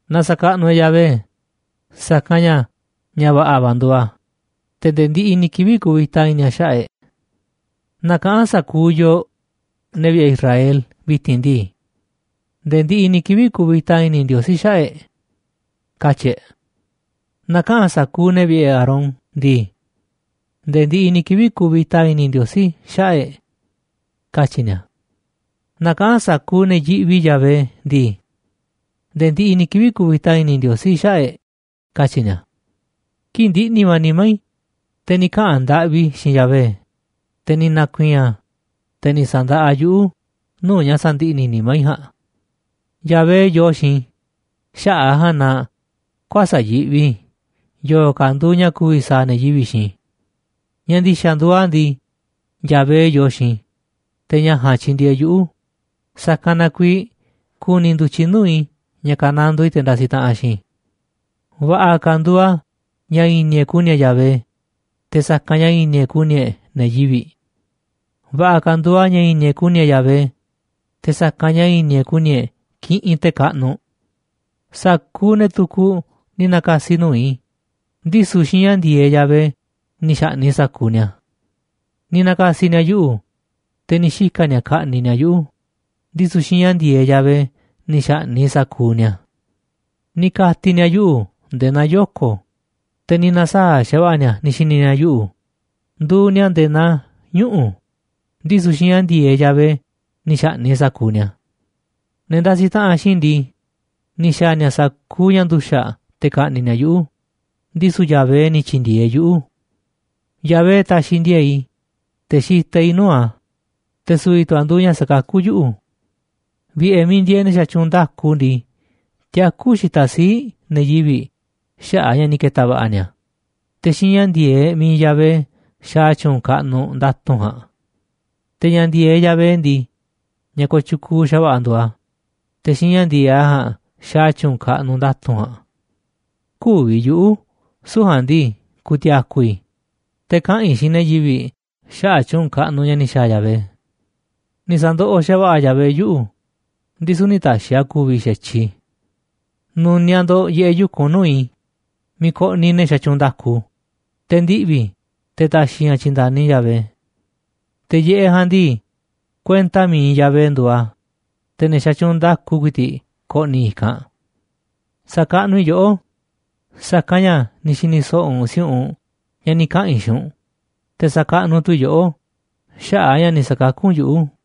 Na sa̱kaꞌnuꞌ e̱ꞌ Yahvé, sa̱kanꞌ ña̱ ña̱ va̱ꞌa̱ va̱ nduuꞌ a̱, te̱ nde̱e̱ ndiꞌiꞌ ni̱ kivi̱ꞌ kuvita i̱ni̱ a̱ xaꞌa̱ꞌ e̱ꞌ. Na kaꞌa̱n sa̱kuuꞌ yooꞌ, ne̱ vi̱ꞌe̱ Israel, vi̱ti̱n ndii: “Nde̱e̱ ndiꞌiꞌ ni̱ kivi̱ꞌ kuvita i̱ni̱ Ndiosí xaꞌa̱ꞌ e̱ꞌ”, katyi̱ e̱ꞌ. Na kaꞌa̱n sa̱kuuꞌ ne̱ vi̱ꞌe̱ Aarón ndii: “Nde̱e̱ ndiꞌiꞌ ni̱ kivi̱ꞌ kuvita i̱ni̱ Ndiosí xaꞌa̱ꞌ e̱ꞌ”, katyi̱ ni̱a̱. Na kaꞌa̱n sa̱kuuꞌ ne̱ yiꞌvi Yahvé ndii: “Nde̱e̱ ndiꞌiꞌ ni̱ kivi̱ꞌ kuvita i̱ni̱ Ndiosí xaꞌa̱ꞌ e̱ꞌ”, katyi̱ ni̱a̱. Kii̱ꞌ ndiꞌni̱ va̱ nimá i̱, te̱ ni̱ kaꞌa̱n ndaꞌvi i̱ xiinꞌ Yahvé, te̱ ni̱ na̱ku̱i̱i̱n a̱, te̱ ni̱ sa̱ndaꞌa a̱ yuꞌu̱ nuu̱ꞌ ña̱ sandiꞌni̱ nimá i̱ ja̱a̱nꞌ. Yahvé yoo xiinꞌ i̱, xaꞌa̱ꞌ a̱ ja̱a̱nꞌ na kuäsa̱ꞌ yiꞌvi i̱ yo̱o̱ ka̱ nduuꞌ ña̱ ku̱vi̱ sa̱a̱ ne̱ yivi̱ꞌ xiinꞌ i̱. Ña̱ ndi̱xa̱ nduuꞌ a̱ ndii, Yahvé yoo xiinꞌ i̱, te̱ ña̱ ja̱a̱nꞌ tyindieeꞌ yuꞌu̱, sa̱kanꞌ na kuiiꞌ ku̱ni̱ ndu̱tyiꞌ nuu̱ꞌ i̱ ña̱ ka̱nandoo i̱ te̱ ndasiꞌ taꞌanꞌ xiinꞌ i̱. Va̱ꞌa̱ ka̱ nduuꞌ a̱ ña̱ i̱ni̱ e̱ꞌ ku̱ni̱ e̱ꞌ Yahvé, te̱ sa̱kanꞌ ña̱ i̱ni̱ e̱ꞌ ku̱ni̱ e̱ꞌ ne̱ yivi̱ꞌ. Va̱ꞌa̱ ka̱ nduuꞌ a̱ ña̱ i̱ni̱ e̱ꞌ ku̱ni̱ e̱ꞌ Yahvé, te̱ sa̱kanꞌ ña̱ i̱ni̱ e̱ꞌ ku̱ni̱ e̱ꞌ kiꞌinꞌ te̱ kaꞌnuꞌ. Sa̱kuuꞌ ne̱ tukuꞌ ni̱ na̱ka̱si̱ nuu̱ꞌ i̱, ndisu̱ xiinꞌ ña̱ ndi̱e̱eꞌ Yahvé ni̱ xa̱ꞌni̱ꞌ i̱ sa̱kuuꞌ ni̱a̱. Ni̱ na̱ka̱si̱ ni̱a̱ yuꞌu̱, te̱ ni̱ xika̱ ni̱a̱ ka̱ꞌni̱ꞌ ni̱a̱ yuꞌu̱, ndisu̱ xiinꞌ ña̱ ndi̱e̱eꞌ Yahvé ni̱ xa̱ꞌni̱ꞌ i̱ sa̱kuuꞌ ni̱a̱. Ni̱ kati̱ ni̱a̱ yuꞌu̱ nde̱e̱ naa yoko̱, te̱ ni̱ na̱saa̱ꞌ xa̱va̱ꞌa̱ ni̱a̱ ni̱ xi̱ni̱ ni̱a̱ yuꞌu̱ nduuꞌ ni̱a̱ nde̱e̱ naa ñuꞌu̱, ndisu̱ xiinꞌ ña̱ ndi̱e̱eꞌ Yahvé ni̱ xa̱ꞌni̱ꞌ i̱ sa̱kuuꞌ ni̱a̱. Ne̱ ndasiꞌ taꞌanꞌ xiinꞌ i̱ ndii, ni̱ xa̱a̱ ni̱a̱ sa̱kuuꞌ ña̱ nduxa̱ꞌ te̱ ka̱ꞌni̱ꞌ ni̱a̱ yuꞌu̱, ndisu̱ Yahvé ni̱ tyi̱ndi̱e̱eꞌ yuꞌu̱. Yahvé taxiꞌ ndi̱e̱e̱ꞌ i̱, te̱ xitaꞌ i̱ nuu̱ꞌ a̱, te̱ su̱vi̱ tu̱ a̱ nduuꞌ ña̱ sakakú yuꞌu̱. Vi̱ꞌe̱ miiꞌ ndieeꞌ ne̱ xatyuunꞌ nda̱ku ndii, tiakú xitaꞌ sii̱ꞌ ne̱ yivi̱ꞌ xaꞌa̱ꞌ a̱ ña̱ ni̱ ke̱ta̱ va̱ꞌa̱ ni̱a̱, te̱ xiinꞌ ña̱ ndi̱e̱eꞌ mi̱iꞌ Yahvé xaaꞌ a̱ tyu̱u̱n kaꞌnuꞌ nda̱tu̱nꞌ ja̱a̱nꞌ. Te̱ ña̱ ndi̱e̱eꞌ Yahvé ndii, ña̱ kooꞌ tyukuuꞌ xa̱va̱ꞌa̱ nduuꞌ a̱, te̱ xiinꞌ ña̱ ndi̱e̱eꞌ a̱ ja̱a̱nꞌ xaaꞌ a̱ tyu̱u̱n kaꞌnuꞌ nda̱tu̱nꞌ ja̱a̱nꞌ. Kü̱vi̱ yuꞌu̱, süu̱ꞌ ja̱a̱nꞌ ndii, ku̱ti̱a̱ku̱ i̱, te̱ kaꞌa̱n i̱ xiinꞌ ne̱ yivi̱ꞌ xaꞌa̱ꞌ tyu̱u̱n kaꞌnuꞌ ña̱ ni̱ xa̱a̱ Yahvé. Ni̱ sa̱ndoꞌoꞌ xa̱va̱ꞌa̱ Yahvé yuꞌu̱, ndisu̱ nï̱ ta̱xi̱ a̱ ku̱vi̱ xa̱tyiꞌ i̱. Nu̱niaꞌ ndo̱ꞌ yiꞌeꞌ yu̱kunꞌ nuu̱ꞌ i̱ miiꞌ koꞌniꞌ ne̱ xatyuunꞌ nda̱ku, te̱ ndiꞌvi̱ i̱, te̱ ta̱xi̱ i̱ ña̱ tyi̱nda̱ni Yahvé. Te̱ yiꞌeꞌ ja̱a̱nꞌ ndii, kuenta mi̱iꞌ Yahvé nduuꞌ a̱, te̱ ne̱ xatyuunꞌ nda̱ku ku̱i̱ti̱ꞌ ko̱ꞌni̱ i̱kanꞌ. Sa̱kaꞌnuꞌ i̱ yoꞌó, sa̱kanꞌ ña̱ ni̱ xi̱ni̱ so̱ꞌo̱ u̱nꞌ si̱u̱ꞌunꞌ ña̱ ni̱ kaꞌa̱n i̱ xiinꞌ u̱nꞌ, te̱ sakaꞌnuꞌ tu̱ i̱ yoꞌó xaꞌa̱ꞌ a̱ ña̱ ni̱ sa̱kakú u̱nꞌ yuꞌu̱.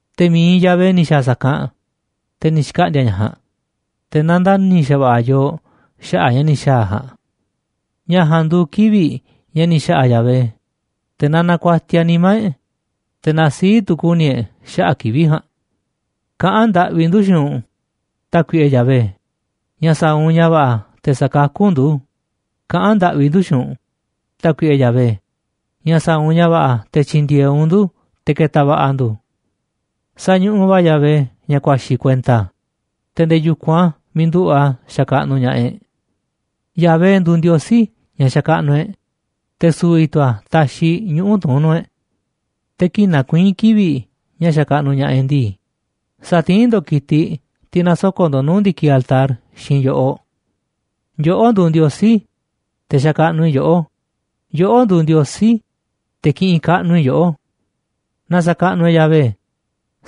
Te̱ mi̱iꞌ Yahvé ni̱ xa̱a̱ sa̱kanꞌ, te̱ ni̱ xkaꞌndi̱a̱ ña̱ ja̱a̱nꞌ, te̱ nandani̱ xa̱va̱ꞌa̱ yooꞌ xaꞌa̱ꞌ ña̱ ni̱ xa̱a̱ a̱ ja̱a̱nꞌ. Ña̱ ja̱a̱nꞌ nduuꞌ kivi̱ꞌ ña̱ ni̱ xa̱ꞌa̱ Yahvé, te̱ na na̱ku̱a̱tiaꞌ nimá e̱ꞌ, te̱ na sii̱ꞌ tu̱ ku̱ni̱ e̱ꞌ xaꞌa̱ꞌ kivi̱ꞌ ja̱a̱nꞌ. Kaꞌán ndaꞌvi ndu̱ xiinꞌ u̱nꞌ, Tákuiꞌe Yahvé, ña̱ sa̱a̱ u̱nꞌ ña̱ va̱ꞌa̱ te̱ sa̱kakú u̱nꞌ ndu̱, kaꞌán ndaꞌvi ndu̱ xiinꞌ u̱nꞌ, Tákuiꞌe Yahvé, ña̱ sa̱a̱ u̱nꞌ ña̱ va̱ꞌa̱ te̱ tyi̱ndi̱e̱eꞌ u̱nꞌ ndu̱ te̱ ke̱ta̱ va̱ꞌa̱ ndu̱. Sañuꞌuꞌ va̱ Yahvé ña̱ ku̱a̱xi̱ kuenta a̱, te̱ nde̱e̱ yu̱kunꞌ a̱ miiꞌ nduꞌu̱ꞌ a̱ xakaꞌnuꞌ ña̱ꞌaꞌ e̱ꞌ. Yahvé nduuꞌ Ndiosí ña̱ xakaꞌnuꞌ e̱ꞌ, te̱ su̱vi̱ tu̱ a̱ taxiꞌ ñuꞌu̱ tuún nuu̱ꞌ e̱ꞌ. tTe̱ kii̱ꞌ nakuiín kivi̱ꞌ ña̱ xakaꞌnuꞌ ña̱ꞌaꞌ e̱ꞌ ndii, sa̱tiín ndo̱ꞌ ki̱tiꞌ, tiꞌ nasoko̱ꞌ ndo̱ꞌ nuu̱ꞌ ndi̱kiꞌ altar xiinꞌ yo̱ꞌoꞌ. Yoꞌó nduuꞌ Ndiosí i̱, te̱ xakaꞌnuꞌ i̱ yoꞌó, yoꞌó nduuꞌ Ndiosí i̱, te̱ kiꞌinꞌ kaꞌnuꞌ i̱ yoꞌó. Na sa̱kaꞌnuꞌ e̱ꞌ Yahvé,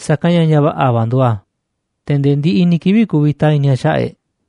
sa̱kanꞌ ña̱ ña̱ va̱ꞌa̱ va̱ nduuꞌ a̱, te̱ nde̱e̱ ndiꞌiꞌ ni̱ kivi̱ꞌ kuvita i̱ni̱ a̱ xaꞌa̱ꞌ e̱ꞌ.